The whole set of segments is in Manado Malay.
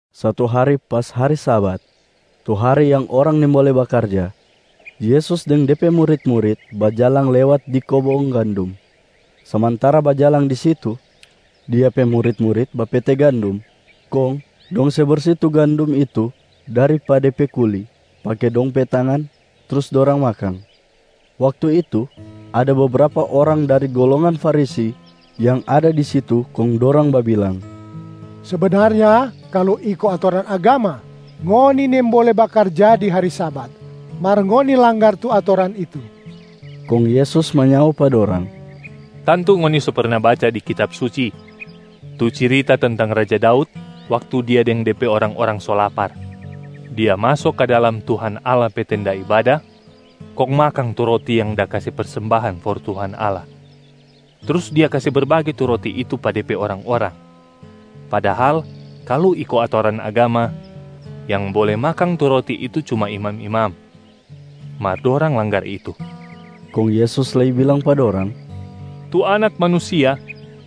Satu hari pas hari Sabat, tu hari yang orang nimbole bakarja, Yesus deng De pe murit-murit bajalang lewat di kobong gandum. Samantara bajalang di situ, Dia pe murit-murit bapete gandum kong dong se bersi tu gandum itu dari pa de pe kuli pake dong pe tangan, trus dorang makang. Waktu itu, ada bebrapa orang dari golongan Farisi yang ada di situ kong dorang babilang, “Sebenarnya kalu iko atoran agama, ngoni nimbole bakarja di hari Sabat, mar ngoni langgar tu atoran itu.” Kong Yesus manyao pa dorang, “Tantu ngoni so perna baca di Kitab Suci tu cirita tentang raja Daud waktu Dia deng de pe orang-orang so lapar. Dia maso ka dalam Tuhan Allah pe tenda ibada, kong makang tu roti yang da kase persembahan for Tuhan Allah, trus dia kase berbage tu roti itu pa de pe orang-orang. Padahal kalu iko atoran agama, yang bole makang tu roti itu cuma tu imam-imam, mar dorang langgar itu.” Kong Yesus lei bilang pa dorang, “Tu Anak Manusia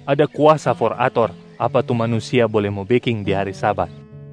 ada kuasa for ator apa tu manusia bole mo beking di hari Sabat.”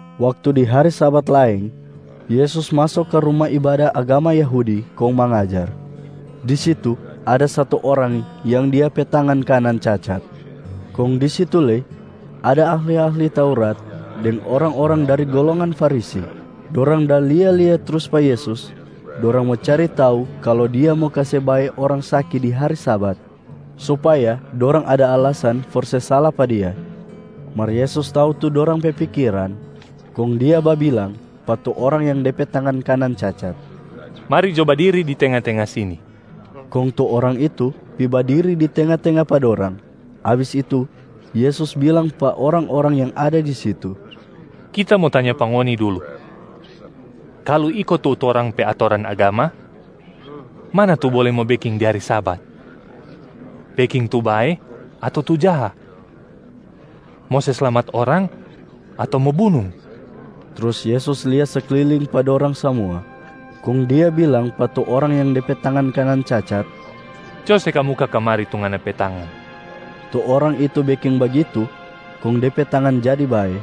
Waktu di hari Sabat laeng, Yesus maso ka ruma ibada agama Yahudi kong mangajar. Di situ ada satu orang yang dia pe tangan kanan cacat. Kong di situ lei ada ahli-ahli Taurat deng orang-orang dari golongan Farisi. Dorang da lia-lia trus pa Yesus, dorang mo cari tau kalu Dia mo kase bae orang saki di hari Sabat supaya dorang ada alasan for se sala pa Dia. Mar Yesus tau tu dorang pe pikiran, kong Dia babilang pa tu orang yang de pe tangan kanan cacat, “Mari jo badiri di tenga-tenga sini!” Kong tu orang itu pi badiri di tenga-tenga pa dorang. Abis itu Yesus bilang pa orang-orang yang ada di situ, “Kita mo tanya pa ngoni dulu. Kalu iko tu torang pe atoran agama, mana tu bole mo beking di hari Sabat? Beking tu bae ato tu jaha? Mo se slamat orang ato mo bunung?” Trus Yesus lia sekliling pa dorang samua, kong Dia bilang pa tu orang yang de pe tangan kanan cacat, “Co se kamuka kamari tu ngana pe tangan!” Tu orang itu beking bagitu kong de pe tangan jadi bae.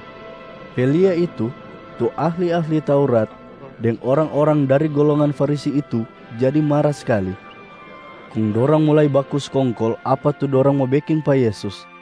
Pe lia itu, tu ahli-ahli Taurat deng orang-orang dari golongan Farisi itu jadi mara skali. Kong dorang mulai baku skongkol apa tu dorang mo beking pa Yesus.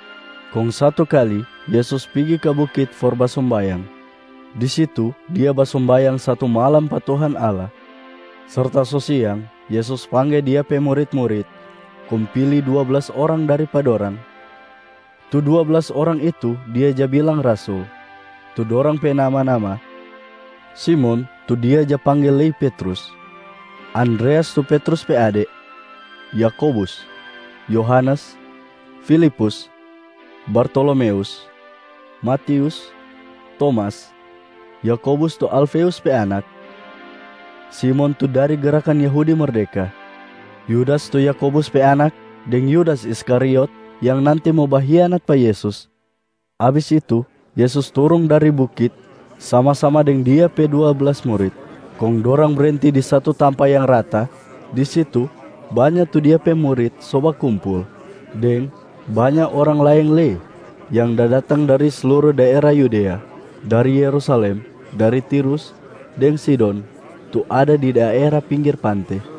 Kong satu kali, Yesus pigi ka bukit for basombayang. Di situ Dia basombayang satu malam pa Tuhan Allah. Serta so siang, Yesus pangge Dia pe murit-murit kong pili dua blas orang dari pa dorang. Tu dua blas orang itu Dia ja bilang rasul. Tu dorang pe nama-nama: Simon tu Dia ja pangge lei Petrus, Andreas tu Petrus pe ade, Yakobus, Yohanes, Filipus, Bartolomeus, Matius, Tomas, Yakobus tu Alfeus pe anak, Simon tu dari Gerakan Yahudi Merdeka, Yudas tu Yakobus pe anak, deng Yudas Iskariot yang nanti mo bahianat pa Yesus. Abis itu, Yesus turung dari bukit sama-sama deng Dia pe dua blas murit, kong dorang brenti di satu tampa yang rata. Di situ banya tu Dia pe murit so bakumpul deng banya orang laeng lei yang da datang dari sluru daera Yudea, dari Yerusalem, dari Tirus deng Sidon tu ada di daera pinggir pante.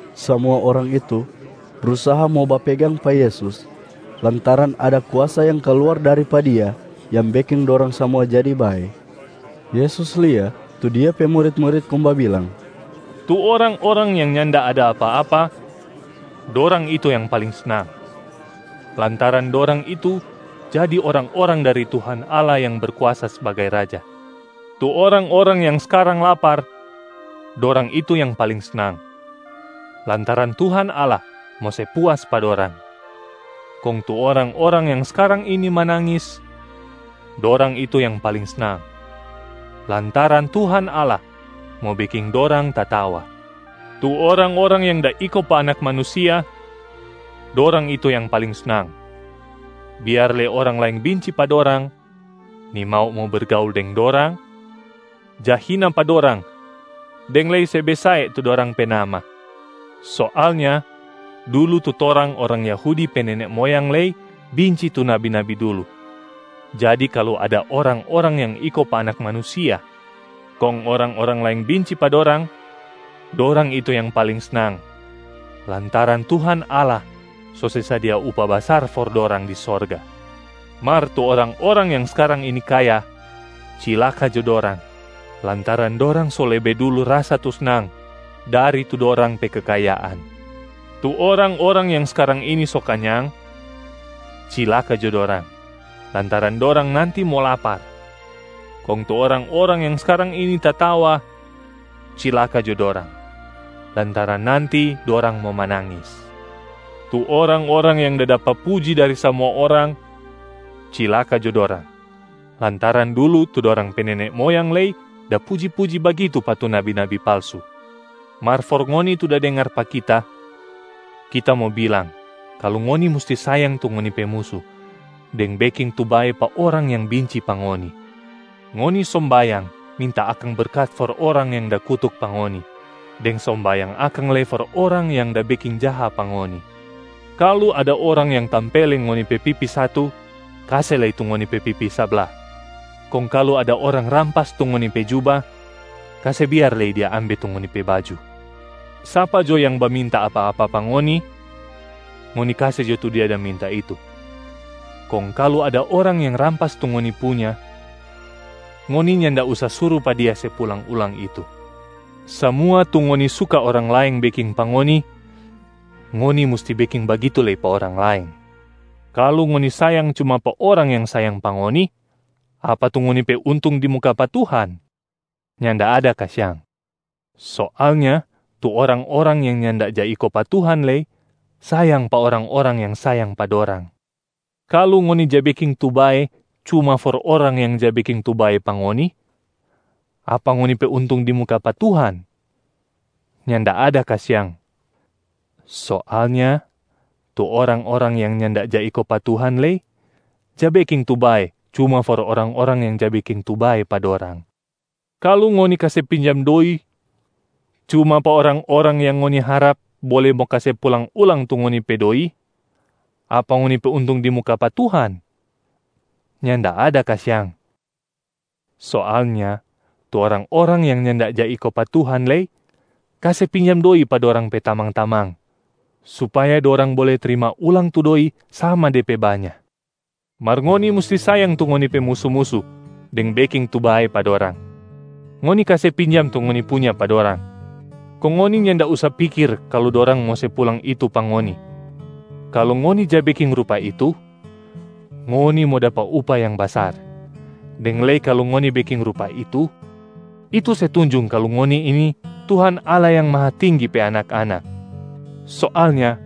Samua orang itu brusaha mo bapegang pa Yesus lantaran ada kuasa yang kaluar dari pa Dia yang beking dorang samua jadi bae. Yesus lia tu Dia pe murit-murit kong babilang, “Tu orang-orang yang nyanda ada apa-apa, dorang itu yang paling snang, lantaran dorang itu jadi orang-orang dari Tuhan Allah yang Berkuasa sbagai Raja. Tu orang-orang yang skarang lapar, dorang itu yang paling snang, lantaran Tuhan Allah mo se puas pa dorang. Kong tu orang-orang yang skarang ini manangis, dorang itu yang paling snang, lantaran Tuhan Allah mo beking dorang tatawa. Tu orang-orang yang da iko pa Anak Manusia, dorang itu yang paling snang, biar lei orang laeng binci pa dorang, nimau mo bergaul deng dorang, ja hina pa dorang deng lei se basae tu dorang pe nama. Soalnya dulu tu torang orang Yahudi pe nene moyang lei binci tu nabi-nabi dulu. Jadi kalu ada orang-orang yang iko pa Anak Manusia kong orang-orang laeng binci pa dorang, dorang itu yang paling snang, lantaran Tuhan Allah so se sadia upah basar for dorang di sorga. Mar tu orang-orang yang skarang ini kaya, cilaka jo dorang lantaran dorang so lebe dulu rasa tu snang dari tu dorang pe kekayaan. Tu orang-orang yang skarang ini so kanyang, cilaka jo dorang lantaran dorang nanti mo lapar. Kong tu orang-orang yang skarang ini tatawa, cilaka jo dorang lantaran nanti dorang mo manangis. Tu orang-orang yang da dapa puji dari samua orang, cilaka jo dorang lantaran dulu tu dorang pe nene moyang lei da puji-puji bagitu pa tu nabi-nabi palsu.” “Mar for ngoni tu da dengar pa Kita, Kita mo bilang kalu ngoni musti sayang tu ngoni pe musu deng beking tu bae pa orang yang binci pa ngoni. Ngoni sombayang minta akang berkat for orang yang da kutuk pa ngoni, deng sombayang akang lei for orang yang da beking jaha pa ngoni. Kalu ada orang yang tampeleng ngoni pe pipi satu, kase lei tu ngoni pe pipi sabla. Kong kalu ada orang rampas tu ngoni pe juba, kase biar lei dia ambe tu ngoni pe baju. Sapa jo yang baminta apa-apa pa ngoni, ngoni kase jo tu dia da minta itu. Kong kalu ada orang yang rampas tu ngoni punya, ngoni nyanda usa suru pa dia se pulang ulang itu. Samua tu ngoni suka orang laeng beking pa ngoni, ngoni musti beking bagitu lei pa orang laeng. Kalu ngoni sayang cuma pa orang yang sayang pa ngoni, apa tu ngoni pe untung di muka pa Tuhan? Nyanda ada kasiang. Soalnya tu orang-orang yang nyanda ja iko pa Tuhan lei sayang pa orang-orang yang sayang pa dorang. Kalu ngoni ja beking tu bae cuma for orang yang ja beking tu bae pa ngoni, apa ngoni pe untung di muka pa Tuhan? Nyanda ada kasiang. Soalnya tu orang-orang yang nyanda ja iko pa Tuhan lei ja beking tu bae cuma for orang-orang yang ja beking tu bae pa dorang. Kalu ngoni kase pinjam doi cuma pa orang-orang yang ngoni harap bole mo kase pulang ulang tu ngoni pe doi, apa ngoni pe untung di muka pa Tuhan? Nyanda ada kasiang. Soalnya tu orang-orang yang nyanda ja iko pa Tuhan lei kase pinjam doi pa dorang pe tamang-tamang, supaya dorang bole trima ulang tu doi sama de pe banya. Mar ngoni musti sayang tu ngoni pe musu-musu deng beking tu bae pa dorang. Ngoni kase pinjam tu ngoni punya pa dorang, kong ngoni nyanda usa pikir kalu dorang mo se pulang itu pa ngoni. Kalu ngoni ja beking rupa itu, ngoni mo dapa upah yang basar, deng lei kalu ngoni beking rupa itu, itu se tunjung kalu ngoni ini Tuhan Allah Yang Mahatinggi pe anak-anak. Soalnya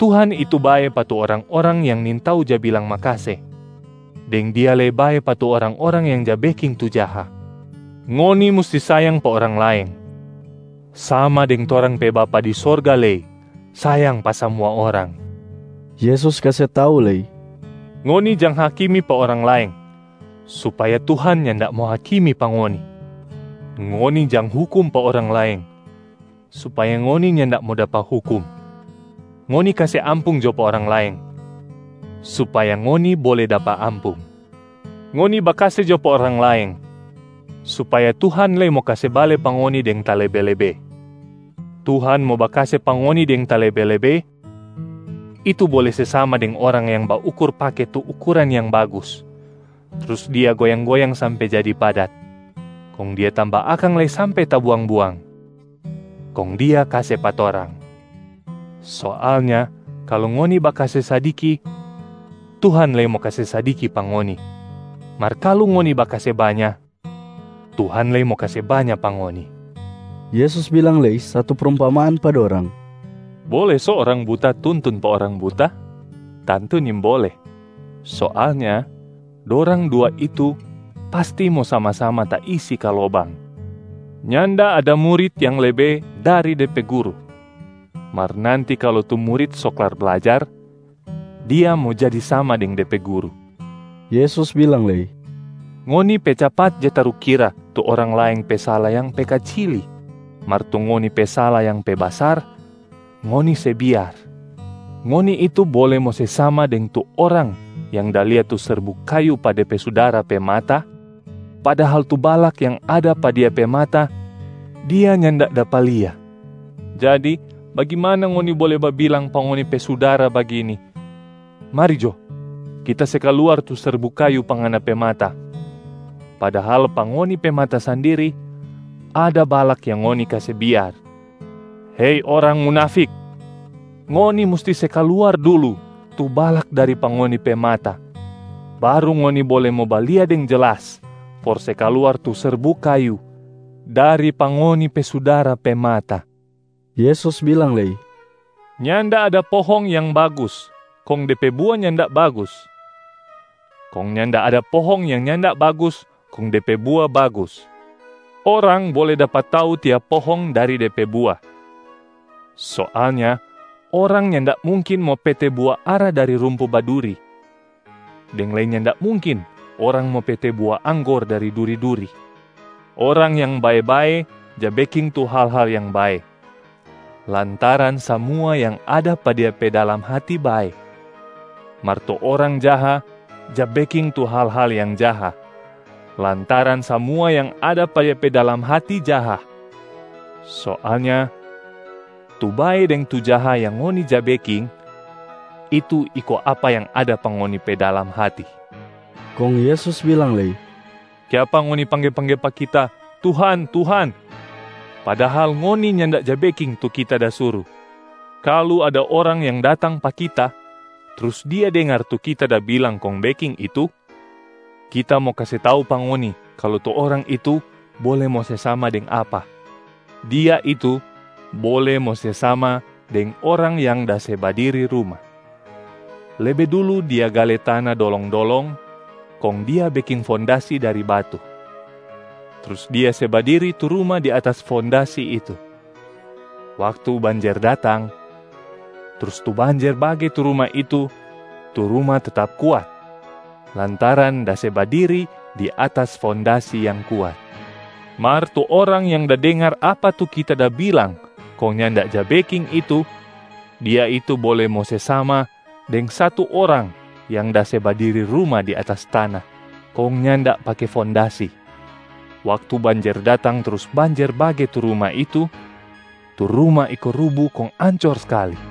Tuhan itu bae pa tu orang-orang yang nintau ja bilang makase, deng Dia lei bae pa tu orang-orang yang ja beking tu jaha. Ngoni musti sayang pa orang laeng, sama deng torang pe Bapa di sorga lei sayang pa samua orang.” Yesus kase tau lei, “Ngoni jang hakimi pa orang laeng, supaya Tuhan nyanda mo hakimi pa ngoni. Ngoni jang hukum pa orang laeng, supaya ngoni nyanda mo dapa hukum. Ngoni kase ampung jo pa orang laeng, supaya ngoni bole dapa ampung. Ngoni bakase jo pa orang laeng, supaya Tuhan lei mo kase bale pa ngoni deng talebe-lebe. Tuhan mo bakase pa ngoni deng talebe-lebe, itu bole se sama deng orang yang baukur pake tu ukuran yang bagus, trus dia goyang-goyang sampe jadi padat, kong dia tamba akang lei sampe tabuang-buang, kong dia kase pa torang. Soalnya kalu ngoni bakase sadiki, Tuhan lei mo kase sadiki pa ngoni. Mar kalu ngoni bakase banya, Tuhan lei mo kase banya pa ngoni.” Yesus bilang lei satu prumpamaan pa dorang, “Bole so orang buta tuntun pa orang buta? Tantu nimbole. Soalnya dorang dua itu pasti mo sama-sama taisi ka lobang. Nyanda ada murit yang lebe dari de pe guru. Mar nanti kalu tu murit so klar blajar, dia mo jadi sama deng de pe guru.” Yesus bilang lei, “Ngoni pe capat ja tarukira tu orang laeng pe sala yang pe kacili, mar tu ngoni pe sala yang pe basar, ngoni se biar. Ngoni itu bole mo se sama deng tu orang yang da lia tu serbuk kayu pa de pe sudara pe mata, padahal tu balak yang ada pa dia pe mata, dia nyanda dapa lia. Jadi bagimana ngoni bole babilang pa ngoni pe sudara bagini, ‘Mari jo, kita se kaluar tu serbuk kayu pa ngana pe mata.’ Padahal pa ngoni pe mata sandiri ada balak yang ngoni kase biar. Hei orang munafik! Ngoni musti se kaluar dulu tu balak dari pa ngoni pe mata, baru ngoni bole mo balia deng jelas for se kaluar tu serbuk kayu dari pa ngoni pe sudara pe mata.” Yesus bilang lei, “Nyanda ada pohong yang bagus kong de pe bua nyanda bagus. Kong nyanda ada pohong yang nyanda bagus kong de pe bua bagus. Orang bole dapa tau tiap pohong dari de pe bua. Soalnya orang nyanda mungkin mo pete bua ara dari rumpu baduri, deng lei nyanda mungkin orang mo pete bua anggor dari duri-duri. Orang yang bae-bae ja beking tu hal-hal yang bae, lantaran samua yang ada pa dia pe dalam hati bae. Mar tu orang jaha ja beking tu hal-hal yang jaha, lantaran samua yang ada pa dia pe dalam hati jaha. Soalnya tu bae deng tu jaha yang ngoni ja beking, itu iko apa yang ada pa ngoni pe dalam hati.” Kong Yesus bilang lei, “Kiapa ngoni pangge-pangge pa Kita, ‘Tuhan, Tuhan’, padahal ngoni nyanda ja beking tu Kita da suru. Kalu ada orang yang datang pa Kita, trus dia dengar tu Kita da bilang kong beking itu, Kita mo kase tau pa ngoni kalu tu orang itu bole mo se sama deng apa: dia itu bole mo se sama deng orang yang da se badiri ruma. Lebe dulu dia gale tana dolong-dolong kong dia beking fondasi dari batu. Trus dia se badiri tu ruma di atas fondasi itu. Waktu banjer datang, trus tu banjer bage tu ruma itu, tu ruma tetap kuat lantaran da se badiri di atas fondasi yang kuat. Mar tu orang yang da dengar apa tu Kita da bilang kong nyanda ja beking itu, dia itu bole mo se sama deng satu orang yang da se badiri ruma di atas tana kong nyanda pake fondasi. Waktu banjer datang trus banjer bage tu ruma itu, tu ruma iko rubu kong ancor skali.”